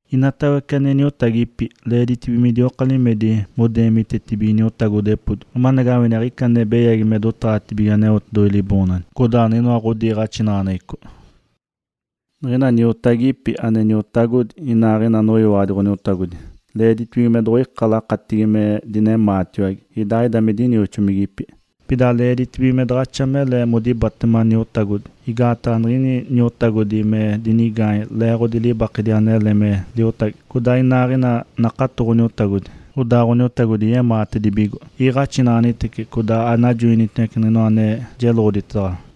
Inatawece ane niotagipi, leeditibige midioka limedi modeemitetibige niotagodepodi, amanagawini aɡ̶ica ane beyagi me dotaɡ̶atigi Aneotedoɡ̶oji Liboonaɡ̶adi, codaa niɡ̶inoa ɡ̶odiiɡ̶axinaɡ̶aneɡ̶eco. Niɡ̶ina niotagipi ane niotagodi inaaɡ̶ina aneyiwaɡ̶adi Ǥoniotagodi leeditibige me doɡ̶oikatice lakatigi me dineemitetiwage idaaɡ̶ida me dinioxomigipi. Pida leeditibige me daɡ̶axa mele modibatema niotagodi, igaataɡ̶a niɡ̶ina niotagodi me dinigaanye leeɡ̶odi libaketedi anele niɡ̶ini liotagi, codaa iniaaɡ̶ini nakato Ǥoniotagodi, odaa Ǥoniotagodi yemaatedibigo. Iiɡ̶axinaɡ̶anitece codaa ajoinaɡ̶anitece niɡ̶inoa ane jeloɡ̶oditedaɡ̶awa.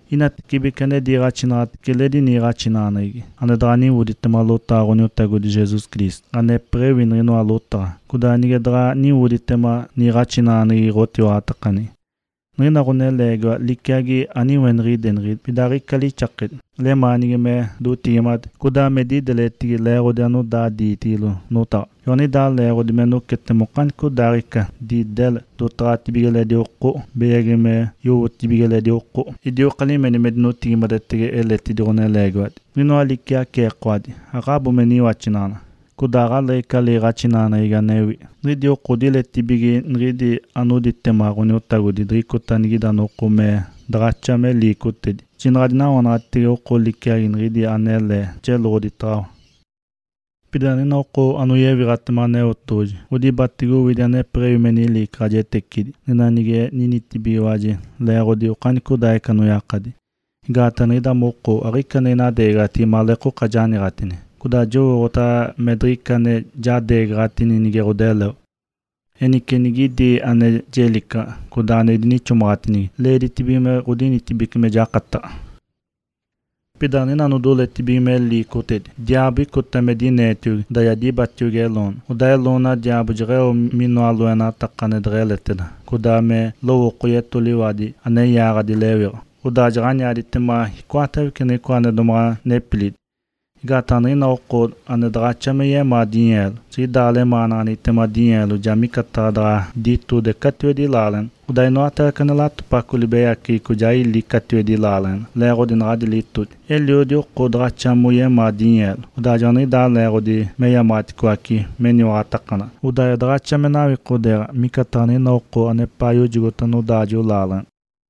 Nigicatibece ane diiɡ̶axinaɡ̶atece eledi niiɡ̶axinaɡ̶aneɡ̶egi, ane daɡ̶a niwoditema lotaɡ̶a Ǥoniotagodi Jesus Cristo, anepeɡ̶ewi niɡ̶inoa lotaɡ̶a, codaa nige daɡ̶a niwoditema niiɡ̶axinaɡ̶aneɡ̶egi ɡ̶otiwaɡ̶atakaneɡ̶egi, niɡ̶ina ɡ̶oneleegiwa liciagi aniweniɡ̶ideneɡ̶egi, pida aɡ̶ica lixakedi. Lemaanigi me dotigimade, codaa me dideletigi leeɡ̶odi anodaa diitigilo notaɡ̶a. Joaniɡ̶idaa leeɡ̶odi me nocetema okanicodaaɡ̶ica, didele, dotaɡ̶atibige eledi oko, beyagi me yowotibige eledi oko, idioka limedi me dinotigimadetege eletidi ɡ̶oneleegiwadi, niɡ̶inoa liciaceekawadi, aɡ̶abo me niwaxinaɡ̶anaɡ̶a, codaa aɡ̶aleeɡ̶ica liiɡ̶axinaɡ̶aneɡ̶egi anewi. Niɡ̶idi oko odiletibige niɡ̶ina anodibatema Ǥoniotagodi diɡ̶icota anigida noko me daɡ̶axa me liicotedi. Jinaɡ̶a adinawanaɡ̶atitege oko liciaco niɡ̶idi analee jeloɡ̶oditaɡ̶awa. Pida niɡ̶ina oko anoyewiɡ̶atema Aneotedoɡ̶oji odibatege owidi anepeɡ̶ewi me niliicaɡ̶ajetecidi, niɡ̶ina nige ninitibigiwaji leeɡ̶odi okanicodaaɡ̶ica anoyakadi. Igaataɡ̶a niɡ̶ida moko aɡ̶ica ane inadeegaɡ̶a maleeka janiiɡ̶atini, codaa jowooɡ̶otaɡ̶a me diɡ̶ica ane jadeegaɡ̶atini nige ɡ̶odeleo. Enice nigidi ane jelicaɡ̶a, codaa ane idinixomaɡ̶atinigi, leeditibige me ɡ̶odinitibece me jakataɡ̶a. Pida niɡ̶ina anodoletibige me liicotedi, diaabo icota me dineetiogi, odaa ja dibatiogi eloona. Odaa eloona diaabo jeɡ̶eo minoa lakataɡ̶a ane deɡ̶eleteda, codaa me lowooko yetoliwadi ane yaaɡ̶adi lewiɡ̶a, odaa jaɡ̶aniaditema icoatawece niɡ̶icoa ane domaɡ̶a nepilidi. Igaataɡ̶a niɡ̶ina oko ane daɡ̶axa me yemaa dinyeelo, niɡ̶ida lemaanaɡ̶aneɡ̶egitema dinyeelo ja micataɡ̶a daɡ̶a ditode catiwedi laaleɡ̶ena. Odaa inoatawece ane latopaco nibeyaceɡ̶eco ja ili catiwedi laaleɡ̶ena leeɡ̶odi naɡ̶adi litodi. Eliodi oko daɡ̶axa moyemaa dinyeelo, odaa joaniɡ̶idaa leeɡ̶odi meyamaɡ̶aticoace meniwaɡ̶atakanaɡ̶a, odaa ja daɡ̶axa me nawikodeeɡ̶a micataɡ̶a niɡ̶ina oko anepaa yojogota nodaajo laaleɡ̶ena.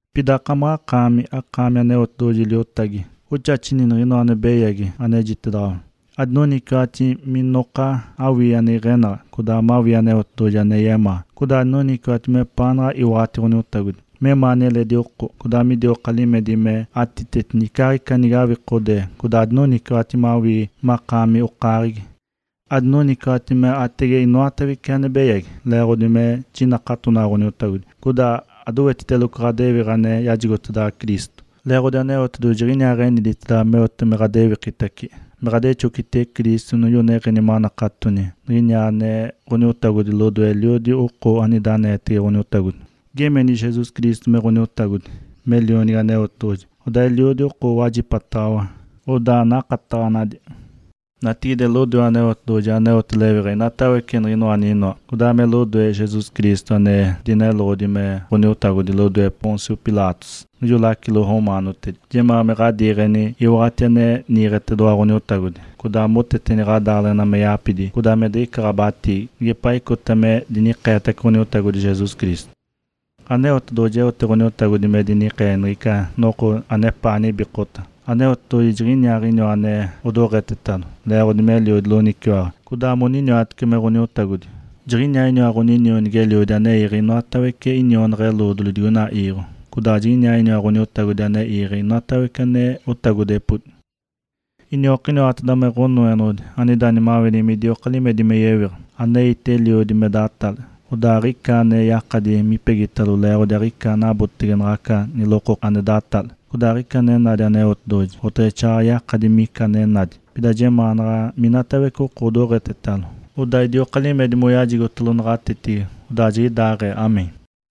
Pida akamaɡ̶akaami anakaami Aneotedoɡ̶oji liotagi, oxaxini niɡ̶inoa ane beyagi anejitedaɡ̶awa. Adinoniciwaɡ̶ati minoka awii ane iɡ̶enaɡ̶a, codaa mawii Aneotedoɡ̶oji ane yemaa, codaa adinoniciwaɡ̶ati mepaanaɡ̶a iwaɡ̶ati Ǥoniotagodi, memaani eledi oko, codaa midioka limedi matiteti icaaɡ̶ica nige awikodee, codaa adinoniciwaɡ̶ati mawii makaami okaaɡ̶egi. Adinoniciwaɡ̶ati me aatege inoatawece ane beyagi, leeɡ̶odi me jinakatonaɡ̶a Ǥoniotagodi, codaa adowetiteloco ɡ̶adewiɡ̶a ane yajigotedaɡ̶awa Cristo. Leeɡ̶odi Aneotedoɡ̶oji jiɡ̶iniaa eniditedaɡ̶awa meote me ɡ̶adewikitace me ɡ̶adexocitege Cristo niɡ̶ijo neɡ̶eni manakatoni niɡ̶iniwa ane Ǥoniotagodi lodoe eliodi oko anida aneetege Ǥoniotagodi. Geemeni Jesus Cristo me Ǥoniotagodi, me Lionigi Aneotedoɡ̶oji, odaa eliodi oko owajipataɡ̶awa, odaa nakataɡ̶anadi. Natigide, lodoe Aneotedoɡ̶oji aneote lewiɡ̶a inoatawece niɡ̶inoa aninoa, codaa me lodoe Jesus Cristo ane dineloɡ̶odi me Ǥoniotagodi lodoe Pôncio Pilatos, niɡ̶ijo lacilo romaanotedi, jemaa me ɡ̶adiiɡ̶eni iwaɡ̶ati ane niiɡ̶etedoɡ̶owa Ǥoniotagodi, codaa moteteni ɡ̶adaaleɡ̶ena me yapidi codaa me diɡ̶ica ɡ̶abatiigi, nigepaa icota me dinikeetace Ǥoniotagodi Jesus Cristo. Aneotedoɡ̶oji eotace Ǥoniotagodi me dinikee niɡ̶ica noko anepaa nibikota. Aneotedoɡ̶oji jiɡ̶iniaaɡ̶iniwa ane odoɡ̶etetalo, leeɡ̶odi meliodi loniciwaɡ̶a, codaa mokiniwatece me Ǥonoenoɡ̶odi. Jiɡ̶iniaaɡ̶iniwa inionigi-eliodi ane iiɡ̶e inoatawece inionaɡ̶a-eloodoli digoina iiɡ̶o, codaa jiɡ̶iniaa Ǥoniotagodi ane iiɡ̶e inoatawece ane otagodepodi. Iniokiniwateda me Ǥonoenoɡ̶odi anida nimaweneɡ̶egi midioka limedi me yewiɡ̶a. Aneite eliodi me datale, odaa aɡ̶ica ane yakadi mipegitalo leeɡ̶odi aɡ̶ica anabotege naɡ̶aca nilokokena ane datale. Codaa aɡ̶ica ane nadi Aneotedoɡ̶oji, oteɡ̶exaaɡ̶aɡ̶a yakadi mica ane nadi. Pida jemaanaɡ̶a minatawece oko odoɡ̶etetalo, odaa idioka limedi moyajigotalo naɡ̶atetigi. Odaa jiɡ̶idaaɡ̶ee (Amém).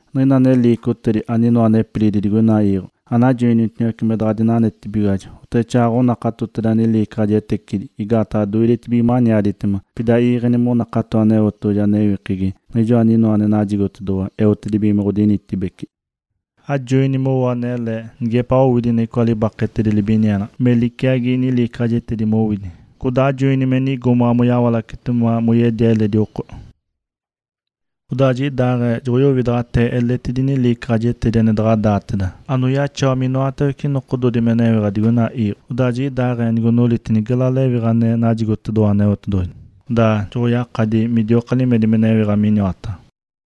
Niɡ̶ina ane liicotedi, aninoa nepilidi digoina iiɡ̶o, anajoinitiniwace me daɡ̶a dinanetibigiwaji, oteɡ̶exaaɡ̶aɡ̶a onakatoteda niliicaɡ̶ajetecidi igaataɡ̶a doidetibige maniaditema. Pida iiɡ̶eni monakato Aneotedoɡ̶oji anewikegi, Niɡ̶ijoa aninoa ane najigotedoɡ̶owa eotedibige me ɡ̶odinitibece. Ajoini mowo anele, nigepaa owidi niɡ̶icoa libaketedi libinienaɡ̶a, me liciagi niliicaɡ̶ajetecidi mowidi. Codaa ajoini me nigomaɡ̶a moyawalace moyedia eledi oko. Odaa nigidaaɡ̶ee joɡ̶oyowidaɡ̶atee eletidi niliicaɡ̶ajetecidi ane daɡ̶a daateda, anoyaxawa minoatawece nokododi me newiɡ̶a digoina iiɡ̶o. Odaa jiɡ̶idaaɡ̶ee nigonoliti gela lewiɡ̶a ane najigotedoɡ̶owa Aneotedoɡ̶oji, odaa joɡ̶oyakadi midioka limedi me newiɡ̶a miniwataɡ̶a.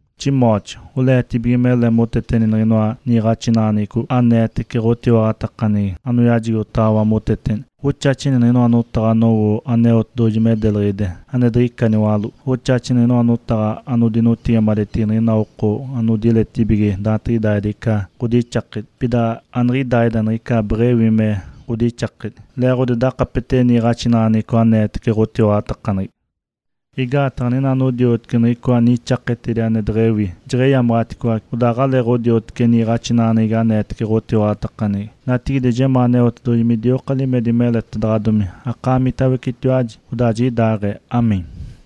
Timóteo. Oleetibige mele moteteni niɡ̶inoa niiɡ̶axinaɡ̶aneɡ̶eco aneetece ɡ̶otiwaɡ̶atakaneɡ̶egi anoyajigotedaɡ̶awa moteteni. Oxaxini niɡ̶inoa notaɡ̶a anowo Aneotedoɡ̶oji me deliɡ̶ide, ane diɡ̶ica niwaló. Oxaxini niɡ̶inoa notaɡ̶a anodinotigimadetigi niɡ̶ina oko anodiletibige daantiɡ̶idaaɡ̶ida ica ɡ̶odixakedi, pida aniɡ̶idaaɡ̶ida niɡ̶ica beɡ̶ewi me ɡ̶odixakedi, leeɡ̶odi dakapetege niiɡ̶axinaɡ̶aneɡ̶eco aneetece ɡ̶otiwaɡ̶atakaneɡ̶egi. Igaataɡ̶a niɡ̶ina anodioteci niɡ̶icoa nixaketedi ane deɡ̶ewi, jeɡ̶eyamaɡ̶aticoace, odaa aɡ̶aleeɡ̶odioteci niiɡ̶axinaɡ̶aneɡ̶eco aneetece ɡ̶otiwaɡ̶atakaneɡ̶egi. Natigide jemaa Aneotedoɡ̶oji midioka limedi meletedaɡ̶adomi akaamitawecetiwaji. Odaa jiɡ̶idaaɡ̶ee (Amém).